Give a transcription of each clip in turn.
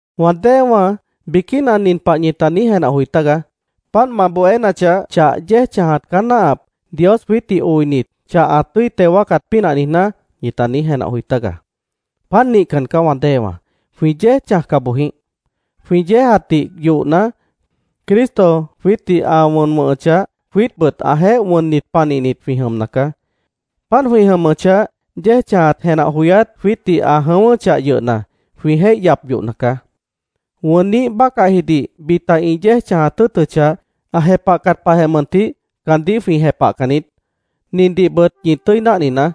Wã déewã biquína nin pah ñita niíj jenah joi tágaá: “Páant ma bohénachah, chah yéej chãjat caá náahap, Dios jwiítdih oinit, chah ã tʉ́i teo wáacat pínah niijná”, ñita niíj jenah joi tágaá. ¡Páant nihcan caá, wã déewã! ¡Jwĩ yéej chãjca boj jĩíh! Jwĩ yéejatdih yohna, Cristo jwiítdih ã wʉn wʉ̃hʉchah, jwiítbʉt ãjeéh wʉnnit panihnit jwĩ jʉmna caá. Páant jwĩ jʉmʉchah, yéej chãjat jenah joyát jwiítdih ã jʉ̃ʉ́wʉ́chah yʉhna, jwĩ jéih yap yohna caá. Wʉnniíh bácahjidih bita ĩ yéej chãjat tʉ́ʉtʉchah, ã jepahcat pahjeh mʉntih caandíh jwĩ jepahcan niít. Nindihbʉt ñi tʉ́i náhninaá: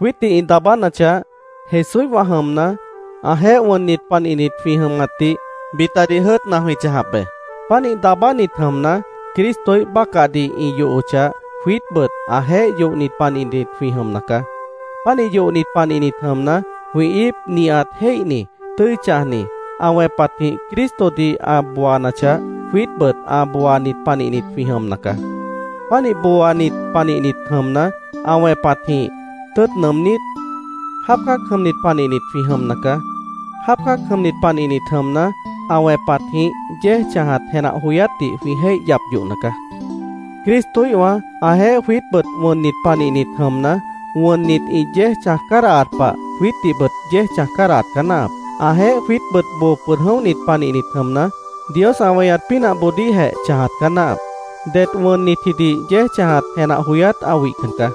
jwiítdih ĩ daabánachah, Jesúíhwã jʉmna, ãjeéh wʉnnit panihnit jwĩ jʉmatdih bitadih jʉ́ʉtna jwĩ chãjap be. Pánih daabánit jʉmna, Cristoíh bácahdih ĩ yohochah, jwiítbʉt ãjeéh yohnit panihnit jwĩ jʉmna caá. Pánih yohnit panihnit jʉmna, jwĩ íip nihat jéihni, tʉ́i chãjni, ã wẽpatjĩh Cristodih ã booanachah, jwiítbʉt ã booanit panihnit jwĩ jʉmna caá. Pánih booanit panihnit jʉmna, ã wẽpatjĩh tʉ́ʉt nʉʉmnít, jáap cã́ac jʉmnit panihnit jwĩ jʉmna caá. Jáap cã́ac jʉmnit panihnit jʉmna, ã wẽpatjĩh yéej chãjat jenah joyátdih jwĩ jéih yap yohna caá. Cristoíhwã ãjeéh jwiítbʉt wʉnnit panihnit jʉmna, wʉnnit ĩ yéej chãj cádahat pah, jwiítdihbʉt yéej chãj cádahat caá náahap. Ãjeéh jwiítbʉt boo pʉd jʉ̃óhnit panihnit jʉmna, Dios ã weñat pínahboodíhjeh chãjat caá náahap. Det wʉnnitjidih yéej chãjat jenah joyát ã wihcan caá.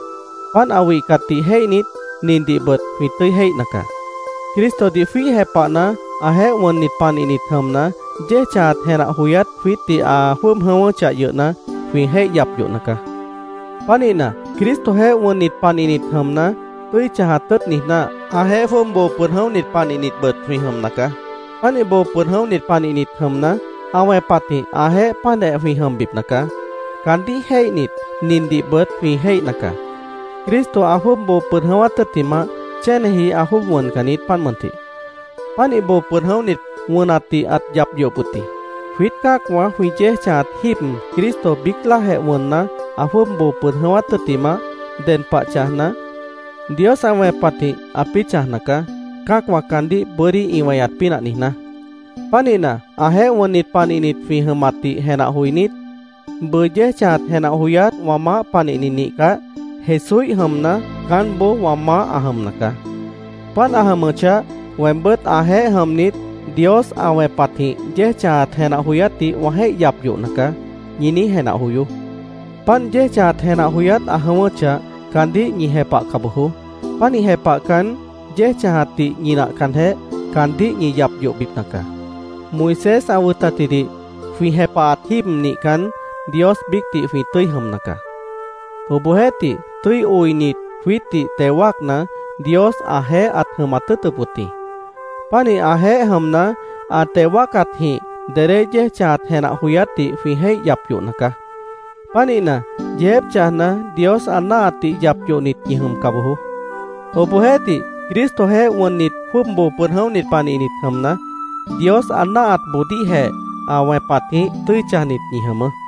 Páant ã wihcatdih jéihnit, nindihbʉt jwĩ tʉ́i jéihna caá: Cristodih jwíih jepahna, ãjeéh wʉnnit panihnit jʉmna, yéej chãjat jenah joyát jwiítdih ã jwʉ́ʉb jʉ̃ʉ́wʉ́chah yʉhna, jwĩ jéih yap yohna caá. Pánihna, Cristojeéh wʉnnit panihnit jʉmna, tʉ́i chãjat tʉ́ʉt niijná, ãjeéh jwʉ́ʉb boo pʉd jʉ̃óhnit panihnitbʉt jwĩ jʉmna caá. Pánih boo pʉd jʉ̃óhnit panihnit jʉmna, ã wẽpatjĩh ãjeéh páantjeh jwĩ jʉmbipna caá. Caandíh jéihnit, nindihbʉt jwĩ jéihna caá: Cristo ã jwʉ́ʉb boo pʉd jʉ̃ʉ́wát tʉ́ttimah, chéneji ã jwʉ́ʉb wʉncan niít, páant mʉntih. Pánih boo pʉd jʉ̃óhnit, wʉnatdih ãt yap yohop wʉt jĩ. Jwiít cã́acwã jwĩ yéej chãjat jíib, Cristo biíc láajeh wʉnna, ã jwʉ́ʉb boo pʉd jʉ̃ʉ́wát tʉ́ttimah, ded pah chãjna, Dios ã wẽpatjĩh ãpĩ́ chãjna caá, cã́acwã caandíh bʉ́dí ĩ weñat pínah niijná. Pánihna, ãjeéh wʉnnit panihnit jwĩ jʉmatdih jenah joinít, “Bʉʉ yéej chãjat jenah joyát wã maáh panihni nihcah, Jesúíh jʉmna, caánboó wã maáh ã jʉmna caá. Páant ã jʉmʉchah, weembʉ́t ãjeéh jʉmnit, Dios ã wẽpatjĩh yéej chãjat jenah joyátdih wã jéih yap yohna caá”, ñi niíj jenah joyoó. Páant yéej chãjat jenah joyát ã jʉ̃ʉ́wʉ́chah, caandíh ñi jepahca bojoó. Pánih jepahcan, yéej chãjatdih ñinahcanjeh, caandíh ñi yap yohbipna caá. Moisés ã wʉtatjidih jwĩ jepahat jíib nihcan, Dios biícdih jwĩ tʉ́i jʉmna caá. Obohjeéhtih, tʉ́i oinit, jwiítdih teo wáacna, Dios ãjeéh ãt jʉmat tʉ́ʉtʉp wʉt jĩ. Pánih ãjeéh jʉmna, ã teo wáacatjĩh dedé yéej chãjat jenah joyátdih jwĩ jéih yap yohna caá. Pánihna, yeejép chãjna, Dios ã náahatdih yap yohnit ñi jʉmca bojoó. Obohjeéhtih, Cristojeéh wʉnnit, jwʉ́ʉb boo pʉd jʉ̃óhnit panihnit jʉmna, Dios ã náahatboodíhjeh ã wẽpatjĩh tʉ́i chãjnit ñi jʉmʉʉ́.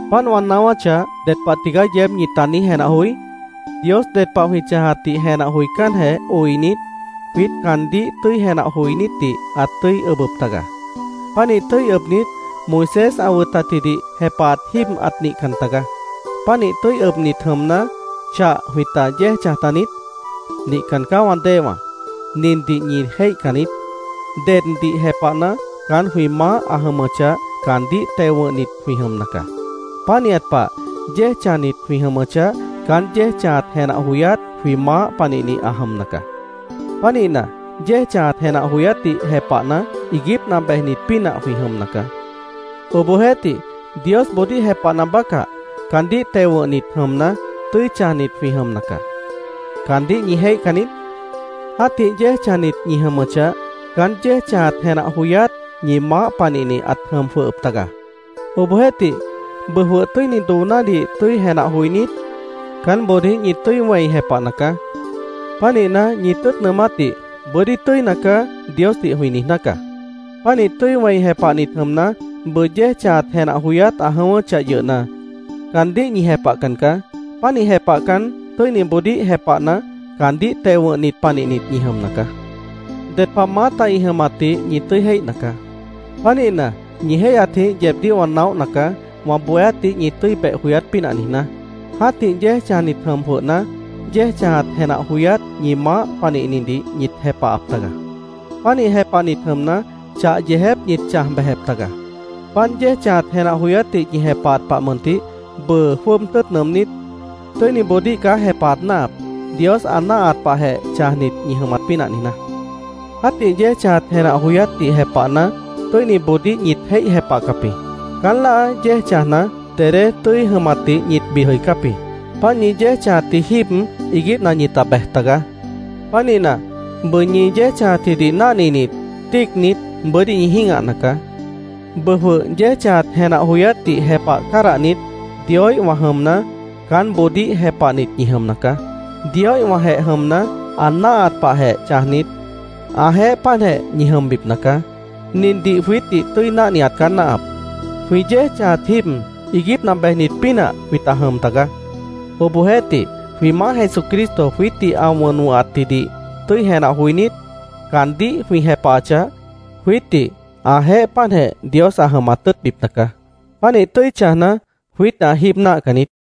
¿Páant wã naáwáchah, ded pah tigaá yeéb ñita niíj jenah joí? Dios ded pah jwĩ chãjatdih jenah joicánjeh oinit, jwiít caandíh tʉ́i jenah joinítdih ãt tʉ́i ʉbʉp taga. Pánih tʉ́i ʉbnit, Moisés ã wʉtatjidih jepahat jíib ãt nihcan taga. Pánih tʉ́i ʉbnit jʉmna, ¿chah jwĩta yéej chãj taniít? ¡Nihcan caá, wã déewã! ¿Nindih ñi jéihcan niít? Deddih jepahna, caán jwĩ maáh ã jʉmʉchah, caandíh teo wʉ̃hnit jwĩ jʉmna caá. Pánihat pah, yéej chãjnit jwĩ jʉmʉchah, caán yéej chãjat jenah joyát jwĩ maáh panihni ã jʉmna caá. Pánihna, yéej chãjat jenah joyátdih jepahna, iiguípna bejnit pínah jwĩ jʉmna caá. Obohjeéhtih, Diosboodíh jepahna bácah, caandíh teo wʉ̃hnit jʉmna, tʉ́i chãjnit jwĩ jʉmna caá. ¿Caandíh ñi jéihcan niít? Jã́tih yéej chãjnit ñi jʉmʉchah, caán yéej chãjat jenah joyát ñi maáh panihni ãt jʉm jwʉhʉp taga. Obohjeéhtih, bʉʉ jwʉh tʉ́ini doonádih tʉ́i jenah joinít, caánboodíh ñi tʉ́i wẽi jepahna caá. Pánihna, ñi tʉ́ʉt nʉʉmátdih “Bʉ́dí tʉ́ina caá”, Diosdih jwĩ niijná caá. Pánih tʉ́i wẽi jepahnit jʉmna, bʉʉ yéej chãjat jenah joyát ã jʉ̃ʉ́wʉ́chah yʉhna, caandíh ñi jepahcan caá. Pánih jepahcan, tʉ́iniboodíh jepahna, caandíh teo wʉ̃hnit panihnit ñi jʉmna caá. Ded pah maáta ĩ jʉmatdih ñi tʉ́i jéihna caá. Pánihna, ñi jéihyatjĩh yeebdíh wã naóhna caá, wã bohéátdih ñi tʉ́i beh joyát pínah niijná. Jã́tih yéej chãjnit jʉm jwʉhna, yéej chãjat jenah joyát ñi maáh panihnidih ñit jepahap taga. Pánih jepahnit jʉmna, chah yeejép ñit chãj bejep taga. Páant yéej chãjat jenah joyátdih ñi jepahat pah mʉntih, bʉʉ jwʉ́ʉb tʉ́ʉt nʉʉmnít, tʉ́iniboodíh caá jepahat náahap, Dios ã náahat pahjeh chãjnit ñi jʉmat pínah niijná. Jã́tih yéej chãjat jenah joyátdih jepahna, tʉ́iniboodíh ñit jéih jepahcap jĩ. Caán láa yéej chãjna, dedé tʉ́i jʉmatdih ñit bid jʉicáp jĩ. Páant ñi yéej chãjatji jíib iiguípna ñita bej tagaá. Pánihna, bʉʉ ñi yéej chãjatjidih náhninit, tíicnit, bʉ́dí ñi jĩ́gahna caá. Bʉʉ jwʉh yéej chãjat jenah joyátdih jepah cádahnit, Dioíhwã jʉmna, caánboodíh jepahnit ñi jʉmna caá. Dioíhwãjeh jʉmna, ã náahat pahjeh chãjnit, ãjeéh páantjeh ñi jʉmbipna caá. Nindih jwiítdih tʉ́i náhniat caá náahap: Jwĩ yéej chãjat jíib, iiguípna bejnit pínah jwĩta jʉm tagaá. Obohjeéhtih, jwĩ Maáh Jesucristo jwiítdih ã wʉn wʉ̃hatjidih tʉ́i jenah joinít, caandíh jwĩ jepahachah, jwiítdih ãjeéh páantjeh Dios ã jʉmat tʉ́ʉtbipna caá. Pánih tʉ́i chãjna, jwiítdih ã jíib náahcan niít.